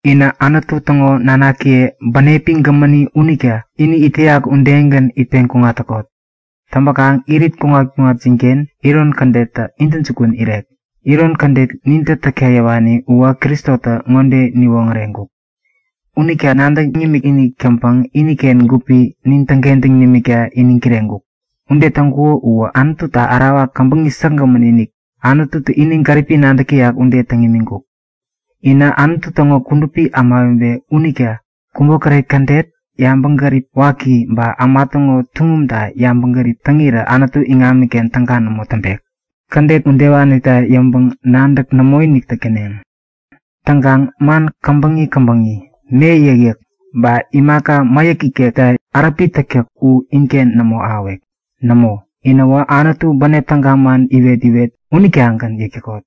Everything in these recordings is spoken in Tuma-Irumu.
Inä Anutu täŋo nanakiye, bänepi gämäni unita ini it täyak udegän itpeŋ kuŋat täkot. Täŋpäkaŋ irit kuŋat-kuŋatjinken iron kädettä intäjukun irek. Iron kädet nintä täkta yäwani uwä Kristotä ŋode niwoŋäreŋkuk; Unitä nadäŋ nimikinik täŋpäŋ iniken gupi nin täŋkentäŋ nimikta iniŋ kireŋkuk. Ude täŋkuko uwä Anututa ärawa käbäŋi säkgämän-inik, Anututä ini gäripi nadäk täyak ude täŋ imiŋkuk. Inä Anutu täŋo kudupi ämawebe unita kubokäret kädet, yabäŋgärip waki ba äma täŋo tuŋumta yabäŋgärip täŋirä Anutu iŋamiken täga nämo täŋpek. Kädet udewanita yäŋpäŋ-nadäk nämoinik täk täneŋ. Täŋkaŋ man käbäŋi-käbäŋi, me yäkyäk, ba imaka mäyäk ikekta äräpi täktäk u inken nämo ahäwek. Nämo, inäwä Anutu bänep täga man iwet-iwet unitagän yäk täkot.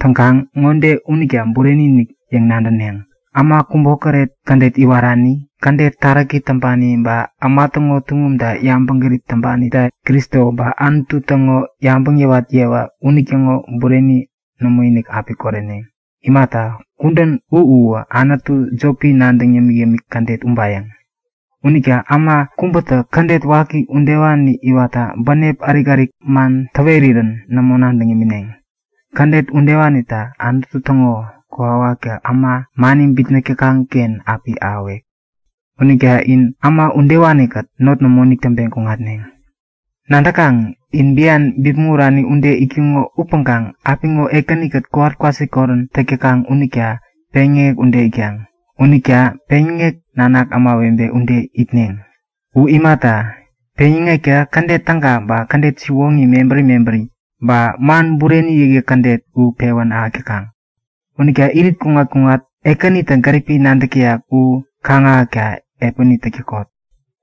Täŋkaŋ ŋode unita bureni-inik yäŋ nadäneŋ; Äma kubokäret kädet iwarani, kädet taräki täŋpani ba äma täŋo tuŋumta yabäŋgärip täŋpanitä Kristo ba Anutu täŋo yabäŋ yäwat yewa unitäŋo bureni nämoinik api koreneŋ. Imata, kudän u uwä anutu jopi nadäŋ yämik-yämik kädet ubayäŋ. Unita äma kubätä kädet waki udewani iwatta bänep ärik-ärik man täwerirän nämo nadäŋ imineŋ. Kädet udewanita Anutu täŋo kokwawaktä äma mani bitnäk täkaŋ-ken api ahäwek. Unita in äma udewani-kät not nämoinik täŋpeŋ kuŋatneŋ. Nadäkaŋ? In bian bipmäŋ urani ude itkuŋo upäŋkaŋ apiŋo Ekäni-kät kowat kwasikorän täk täkaŋ unita peŋyäŋek ude itkaŋ. Unita peŋyäŋek nanak ämawebe ude itneŋ. U imata, peŋyäŋektä kädet täga ba kädet siwoŋi mebäri mebäri, ba man bureni yäkyäk kädet u pewän ahäk täkaŋ. Unita irit-kuŋat-kuŋat Ekänitä gäripi nadäk täyak u kaŋ-ahäkta piäni täk täkot.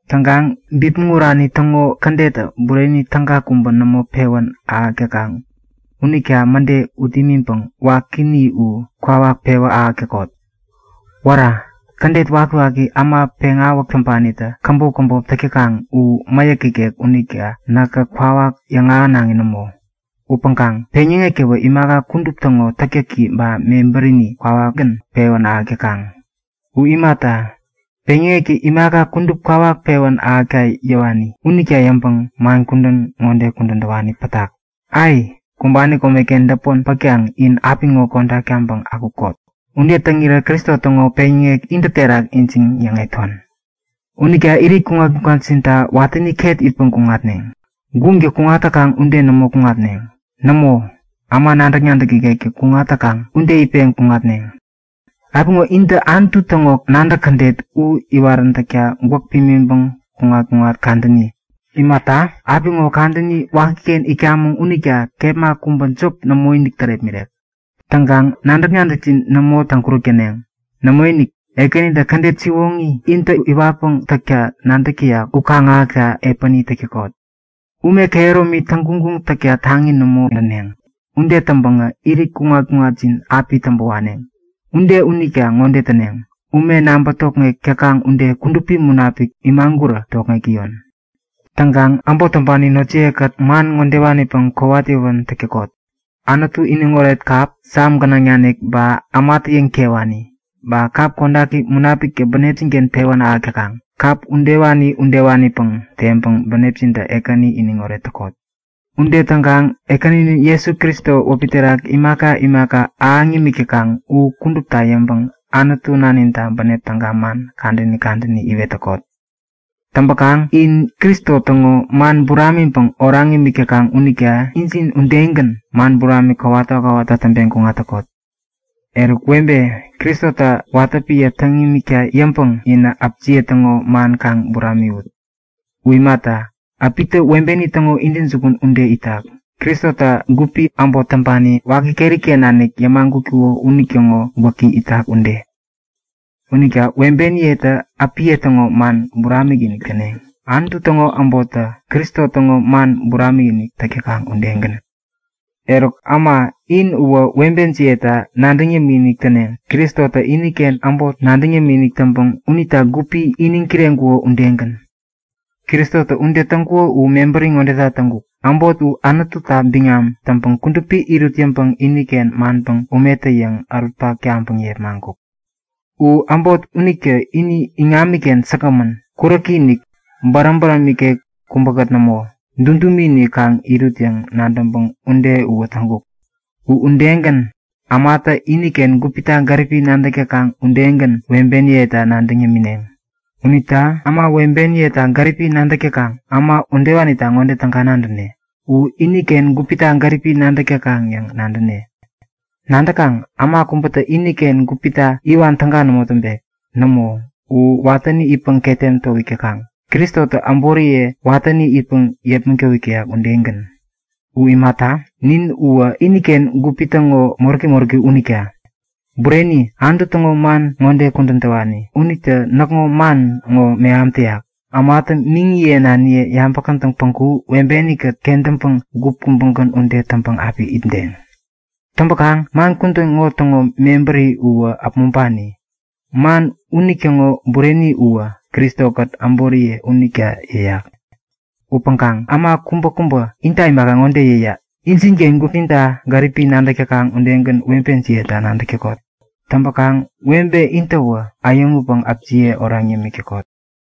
Täŋkaŋ bipmäŋ urani täŋo kädettä bureni täga kubä nämo pewän ahäk täkaŋ unita mäde ut imiŋpäŋ wakini u kwawak pewä ahäk täkot. Wära! Kädet wakiwaki äma peŋawäk täŋpanitä käbop käbop täk täkaŋ u mäyäk ikek unita näkä kwawak yäŋahänaŋi nämo. Upäŋkaŋ-peŋyäŋektäwä imaka kudup täŋo täktäki ba mebärini kwawakgän pewän ahäk täkaŋ. U imata, peŋyäŋektä imaka kudup kwawak pewän ahäkta yäwani. Unita yäŋpäŋ man kubä ŋode kudän täwani pätak; Ai! Kumbani komeken däpmon pätkaŋ in apiŋo kodak taŋpäŋ akukot! Ude täŋirä Kristo täŋo peŋyäŋek intä terak ijiŋ-yäŋeton. Unita irit kuŋat-kuŋatjinta watäni ket itpäŋ kuŋatneŋ. Guŋtä kuŋat täkaŋ ude nämo kuŋatneŋ. Nämo, äma nadäk-nadäk ikektä kuŋat täkaŋ ude itpeŋ kuŋatneŋ. Apiŋo intä Anutu täŋo nadäk kädet u iwaräntäkta gwäk pimiŋpäŋ kuŋat-kuŋat kadäni. Imata, apiŋo kadäni wakiken itkamäŋ unita kepma kubä jop nämoinik tärepmirek. Täŋkaŋ nadäk-nadäkjin nämo täŋkuräk täneŋ. Nämoinik, Ekänitä kädet siwoŋi intä iwatpäŋ täkta nadäk täyak u kaŋ-ahäkta piäni täk täkot. Täŋkaŋ ume komi täŋguŋguŋ täkta taŋi nämo näneŋ. Ude täŋpäŋä irit kuŋat-kuŋatjin api täŋpäwaneŋ. Ude unita ŋode täneŋ; Ume naŋpä tokŋek täkaŋ ude Kudupi Munapik imagurä tokŋek täyon. Täŋkaŋ äbot täŋpani notjiye-kät man ŋodewanipäŋ kowat yäwän täk täkot; Anutu iniŋoret kap Sam gänaŋ nanik ba ämatä yäŋtewani, ba kap kodaki Munapiktä bänepjin-ken pewän ahäk täkaŋ, kap udewani-udewanipäŋ teŋpäŋ bänepjintä Ekäni iniŋoret täkot. Ude täŋkaŋ Ekäninin Jesu Kristo wäpi terak imaka imaka ahäŋ nimik täkaŋ u kudupta yäŋpäŋ Anutu Naninta bänep täga man kadäni kadäni iwet täkot. Täŋpäkaŋ in Kristo täŋo man buramiŋpäŋ oraŋ imik täkaŋ unita injin udegän, man buramik kowata kowata täŋpeŋ kuŋat täkot. Eruk webe, Kristota watä piä täŋ imikta yäŋpäŋ inä äpjiye täŋo man kaŋ buramiwut. U imata, äpitä webeni täŋo intäjukun ude itak, Kristotä gupi, äbot täŋpani waki keri-ken nanik yämagutkuko unitäŋo gwäki itak ude. Unita webeniyetä äpiye täŋo man buramik-inik täneŋ, Anutu täŋo äbottä Kristo täŋo man buramik-inik täk täkaŋ udegän. Eruk äma, in uwä webejiyeta nadäŋ yämikinik täneŋ, Kristotä iniken äbot nadäŋ yämikinik täŋpäŋ unita gupi iniŋ kireŋkuko udegän. Kristotä ude täŋkuko u mebäri ŋodeta täŋkuk; Äbot u Anututa biŋam täŋpäŋ kudupi irut yäŋpäŋ iniken manpäŋ umetä-yäŋ ärutpak taŋpäŋ yepmaŋkuk. U äbot unitä ini iŋamiken säkgämän, kuräki-inik, bäräm bäräm nikek kubäkät nämo, dudumi-inik kaŋ irut yäŋ nadäŋpäŋ ude uwä täŋkuk. U udegän, ämatä iniken gupita gäripi nadäk täkaŋ udegän webeniyeta nadäŋ yämineŋ. Unita äma, webeniyeta gäripi nadäk täkaŋ, äma udewanita ŋode täga nadäne; U iniken gupita gäripi nadäk täkaŋ yäŋ nadäne. Nadäkaŋ, äma kubätä iniken gupita iwan täga nämo täŋpek. Nämo, u watäni itpäŋ ketem towik täkaŋ, Kristotä äboriye watäni itpäŋ yepmäŋ towik täyak udegän. U imata, nin uwä iniken gupi täŋo moräki moräki unita. Bureni, Anutu täŋo man ŋode kudän täwani unitä näkŋo man ŋo meham täyak; Ämatä miŋiye naniye yabä-kätäŋ päŋku webeni-kät kentäŋpäŋ gup kubägän ude täŋpäŋ api itdeŋ. Täŋpäkaŋ man kudän ŋo täŋo mebäri uwä äpmoŋpani. Eruk man unitäŋo bureni uwä Kristo-kät äboriye unita yäyat. Upäŋkaŋ äma kubäkubä inta imaka, ŋode yäyak; Injinken gupjinta gäripi nadäk täkaŋ udegän webejiyeta nadäk täkot. Täŋpäkaŋ webe intäwä äyäŋutpäŋ äpjiye oraŋ yämik täkot.